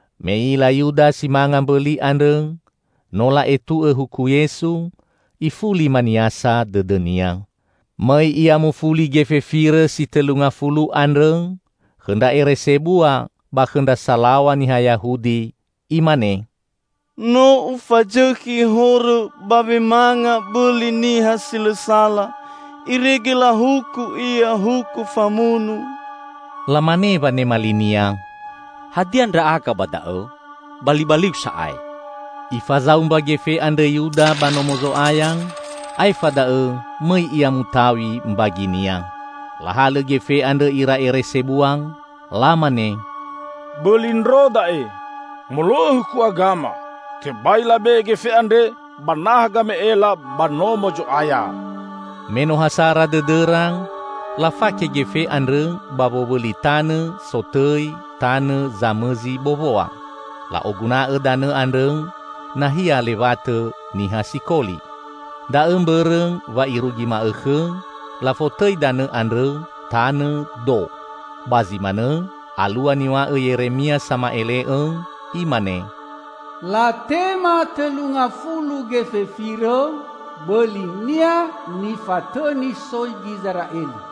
Me i'ila Yuda si manga mbõli andrõ no la'etu'õ huku Yesu, ifuli maniasa dõdõnia. Mõi ia mufuli gefe firõ si tõlu ngafulu andrõ khõ ndra ere sebua ba khõ ndra salaw̃a niha Yahudi. Imane, "No ufazõkhi horõ ba wemanga bõli niha si lõ sala, irege lahuku Ia huku famunu!" Lamane wanema linia, "Hadia ndra'aga ba da'õ? Balibaliu sa'ae!" Ifazaumba gefe andrõ Yuda ba Nomo Zo'aya, aefa da'õ mõi ia mutaw̃i mbaginia. Lahalõ gefe andrõ ira ere sebua lamane, "Bõli ndro da'e. Molo'õ huku agama, tebai labe'e gefe andre ba naha game'ela ba Nomo Zo'aya." Me no ha sara dõdõra, lafake gefe andrõ ba wowõli tanõ sotõi Tanõ Zamõzi Bowoa. La'oguna'õ danõ andrõ nahia lewatõ niha sikoli. Da'õ mbõrõ wa irugi ma'õkhõ lafotõi danõ andrõ, "Tanõ Do". Ba zi manõ alua niw̃a'õ Yeremia sama'ele'õ, imane, "Latema tõlu ngafulu gefe firõ, bõli-Nia nifatõni soi Gizera'eli.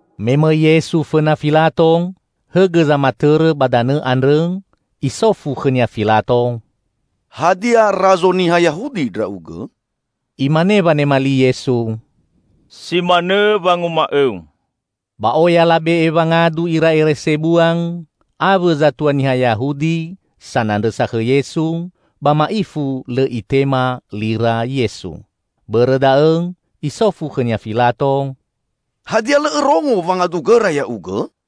Me mõi Yesu fõna Filato, hõgõ zamatõrõ ba danõ andrõ, isofu khõ-Nia Filato, "Hadia razo niha Yahudi Ndra'ugõ?" Imane wanema li Yesu, "Si manõ wanguma'õu." Ba oya labe'e wangadu ira ere sebua awõ zatua niha Yahudi sanandrõsa khõ Yesu, ba ma'ifu lõ Itema lira Yesu. Bõrõ da'õ isofu khõ-Nia Filato, "Hadia lõ Õrongo wangadugõra Ya'ugõ?"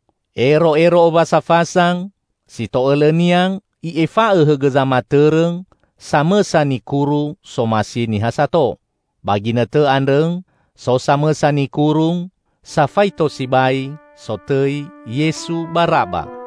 Ero'ero Owasa Fasa, si to'õlõnia i'efa'õ hõgõ zamatõrõ samõsa nikuru somasi niha sato. Ba ginõtõ andrõ so samõsa nikuru, safaito sibai, sotõi Yesu Baraba.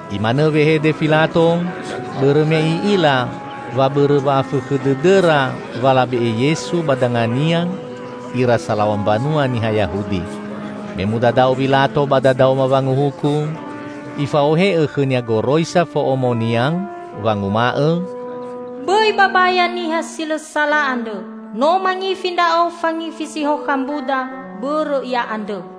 Imanõ wehede Filato bõrõ me i'ila wa bõrõ wa'afõkhõ dõdõra wa labe'e Yesu ba dangania ira salaw̃a mbanua niha Yahudi. Me mudadao Wilato ba dadaoma wanguhuku, ifa'ohe'õ khõnia goroisa fo'omonia wanguma'õ, "Bõi babaya niha si lõ sala andrõ. No mangifi ndra'o fangifi si hokha mbuda bõrõ Ia andrõ."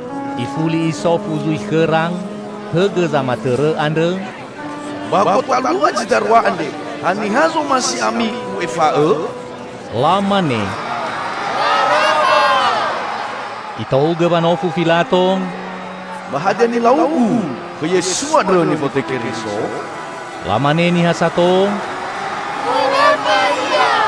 Ifuli isofu zui khõra hõgõ zamatõrõ andrõ, "Ba gotalua zi darua andre haniha zomasi ami u'efa'õ?" Lamane, "Baraba!" Itohugõ wanofu Filato, "Ba hadia nilaugu khõ Yesu andrõ nifotõi Keriso?" Lamane niha sato, "Forõfa Ia!"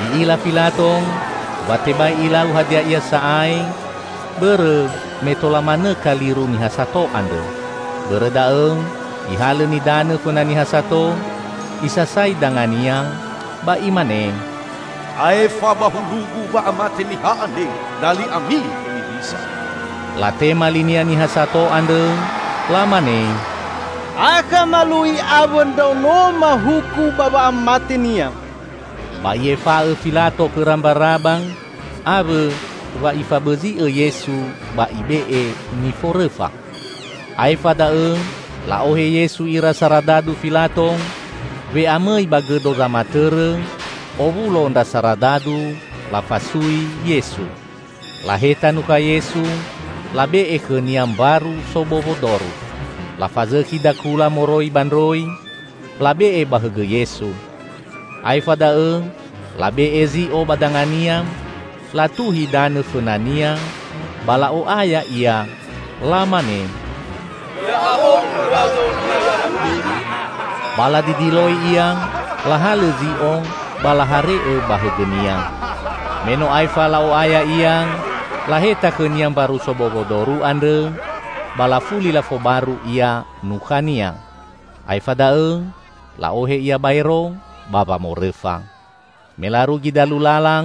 I'ila Filato wa tebai ilau hadia ia sa'ae, bõrõ me tola manõ kaliru niha sato andrõ. Bõrõ da'õ, ihalõ nidanõ fõna niha sato, isasai dangania ba imane, "Aefa ba hulugu wa'amate niha andre! Dali ami hemiwisa!" Latema linia niha sato andrõ lamane, "Akha malu'i awõ ndraonoma huku ba wa'amate-Nia!" Ba i'efa'õ Filato khõra Mbaraba, awõ wa ifabõzi'õ Yesu, ba ibe'e niforõfa! Aefa da'õ la'ohe Yesu ira saradadu Filato we'amõi ba gõdo zamatõrõ, owulo ndra saradadu, lafasui Yesu. Laheta nukha Yesu, labe'e khõ-Nia mbaru sobowo doru. Lafazõkhi dakula moroi ba ndroi, labe'e ba hõgõ Yesu. Aefa da'õ labe'e zi'o ba danga-Nia, latuhi danõ fõna-Nia ba la'o'aya Ia lamane, "Ya'ahowu Razo Niha Yahudi!" Ba ladidiloi Ia, lahalõ zi'o ba lahare'õ ba hõgõ-Nia. Me no aefa la'o'aya Ia, laheta khõ-Nia mbaru sobowo doru andrõ ba lafuli lafobaru Ia nukha-Nia. Aefa da'õ la'ohe Ia baero ba wamorõfa. Me larugi dalu lala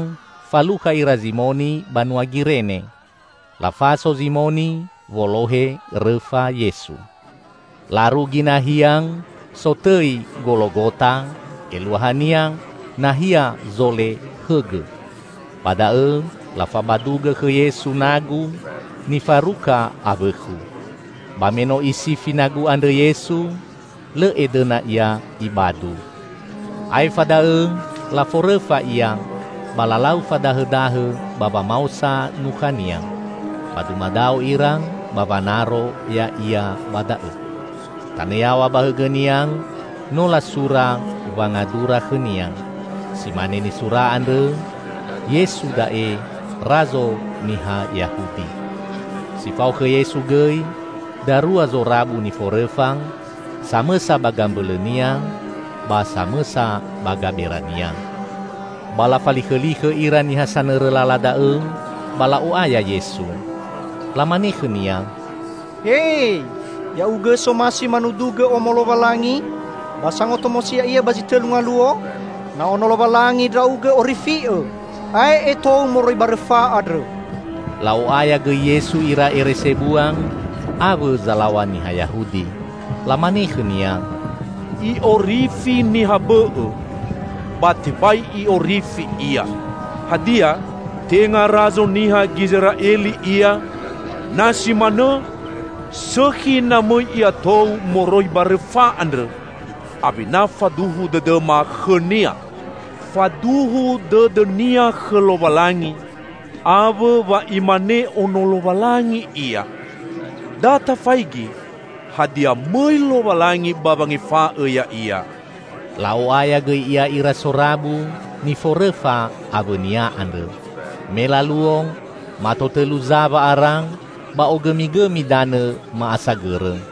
falukha ira Zimoni banua Girene. Lafaso Zimoni wolohe rõfa Yesu. Larugi nahia sotõi Gologota, eluahania, "Nahia zole hõgõ." Ba da'õ lafabadugõ khõ Yesu nagu nifaruka awõkhu. Ba me no isifi nagu andrõ Yesu, lõ edõna Ia Ibadu. Aefa da'õ laforõfa Ia, ba lalau fadahõdahõ ba wamaosa nukha-Nia. Ba dumadao ira ba wanaro Ya'ia ba da'õ. Tanõ yaw̃a ba hõgõ-Nia no lasura wangadura khõ-Nia. Si mane nisura andrõ, "Yesu da'e, Razo Niha Yahudi!" Si fao khõ Yesu gõi, darua zorabu niforõfa, samõsa ba gambõlõ-Nia ba samõsa ba gabera-Nia. Ba lafalikhõlikhõ ira niha sanõrõ lala da'õ ba la'o'aya Yesu. Lamane khõ-Nia, "He, Ya'ugõ somasi manudugõ Omo Lowalangi, ba sangotomosi ya'ia ba zi tõlu ngaluo! Na Ono Lowalangi Ndra'ugõ, orifi'Õ! Ae'e tou moroi ba rõfa andrõ!" La'o'aya gõi Yesu ira ere sebua awõ zalaw̃a niha Yahudi. Lamane khõ-Nia. "I'orifi niha bõ'õ, ba tebai I'orifi Ia! Hadia, tenga Razo niha Gizera'eli Ia? Na si manõ, sõkhi na mõi Ia tou moroi ba rõfa andrõ, awena faduhu dõdõma khõ-Nia. Faduhu dõdõ-Nia khõ Lowalangi, awõ wa Imane Ono Lowalangi Ia. Da tafaigi, hadia mõi Lowalangi, ba wangefa'õ Ya'ia." La'o'aya gõi Ia ira sorabu niforõfa awõ-Nia andrõ. Me laluo, mato tõlu za wa'ara, ba ogõmigõmi danõ ma'asagõrõ.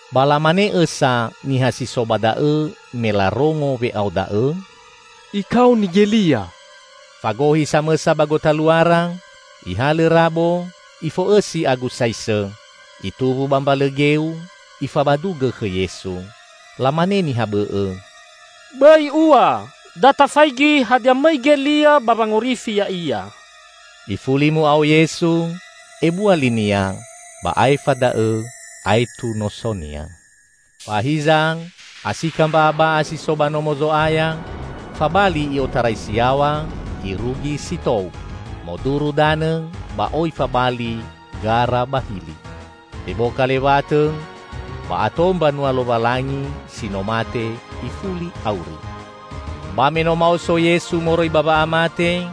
Ba lamane õsa niha si so ba da'õ me larongo we'ao da'õ, "Ikaoni Gelia!" Fagohi samõsa ba gotaluara, ihalõ rabo, ifo'õsi agu saisõ. Ituwu ba mbalõ geu, ifabadugõ khõ Yesu. Lamane niha bõ'õ, "Bõi ua! Da tafaigi hadia mõi Gelia ba wangorifi Ya'ia!" Ifuli mu'ao Yesu ebua li-Nia, ba aefa da'õ aetu noso-Nia. Ba hiza, asika mba'aba'a si so ba Nomo Zo'aya, fabali i'otarai si yaw̃a irugi si tou. Moduru danõ ba oi fabali gara ba hili. Teboka lewatõ, ba ato mbanua Lowalangi si no mate, ifuli auri. Ba me no maoso Yesu moroi ba wa'amate,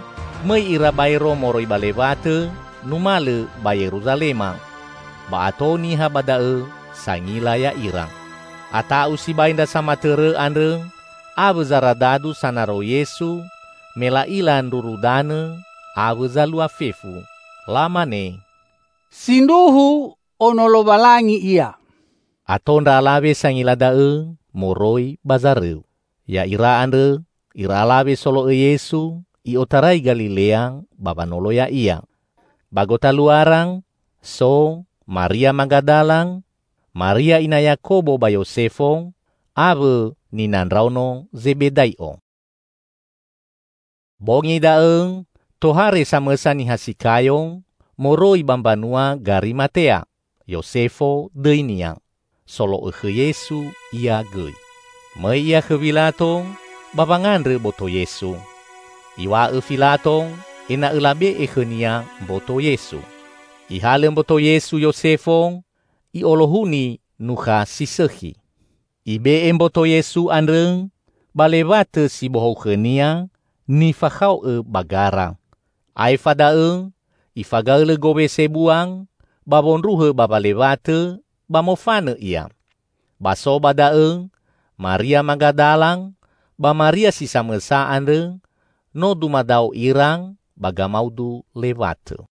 mõi ira baero moroi ba lewatõ, numalõ ba Yerusalema. Ba ato niha ba da'õ sangila ya'ira. Ata'u sibai ndra samatõrõ andrõ awõ zaradadu sanaro Yesu me la'ila ndruru danõ awõ zalua fefu. Lamane, "Sindruhu Ono Lowalangi Ia!" Ato ndra alawe sangila da'õ moroi ba zarõu. Ya'ira andrõ ira alawe solo'õ Yesu i'otarai Galilea ba wanolo Ya'ia. Ba gotaluara so Maria Magadala, Maria ina Yakobo ba Yosefo awõ nina ndraono Zebedai'o. Bongi da'õ, tohare samõsa niha si kayo moroi ba mbanua Garimatea. Yosefo dõinia. Solo'õ khõ Yesu ia gõi. Mõi ia khõ Wilato, ba wangandrõ boto Yesu. Iw̃a'õ Filato ena'õ labe'e khõnia mboto Yesu. Ihalõ mboto Yesu Yosefo, i'olohuni nukha si sõkhi. Ibe'e mboto Yesu andrõ ba lewatõ si bohou khõnia nifakhao'õ ba gara. Aefa da'õ ifagaõlõ gowe sebua ba wondruhõ bawa lewatõ, ba mofanõ ia. Ba so ba da'õ Maria Magadala ba Maria si samõsa andrõ, no dumadao ira ba gamaudu lewatõ.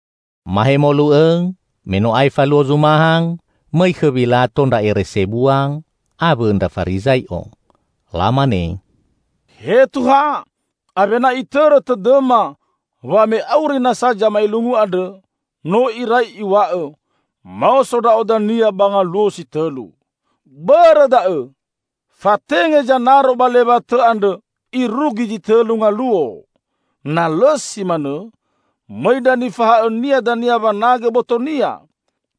Mahemolu õ, me no aefa luo Zumaha, mõi khõ Wilato ndra ere sebua awõ ndra Farizai'o. Lamane, "He Tuha, awena itõrõ tõdõma wa me auri nasa zamaelungu andrõ, no irai Iw̃a'õ, 'Maoso Ndra'o dania ba ngaluo si tõlu.' Bõrõ da'õ, fatenge zanaro ba lewatõ andrõ irugi zi tõlu ngaluo. Na lõ si manõ, mõi ndra nifahaõ-Nia dania wanagõ boto-Nia,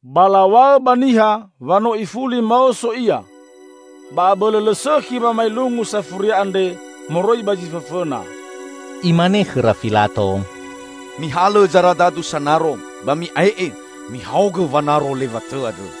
ba law̃aõ ba niha wa no ifuli maoso Ia. Ba abõlõ lõ sõkhi wamaelungu safuria andre moroi ba zi fõfõna." Imane khõra Filato, "Mihalõ zaradadu sanaro, ba mi'ae'e mihaogõ wanaro lewatõ andrõ."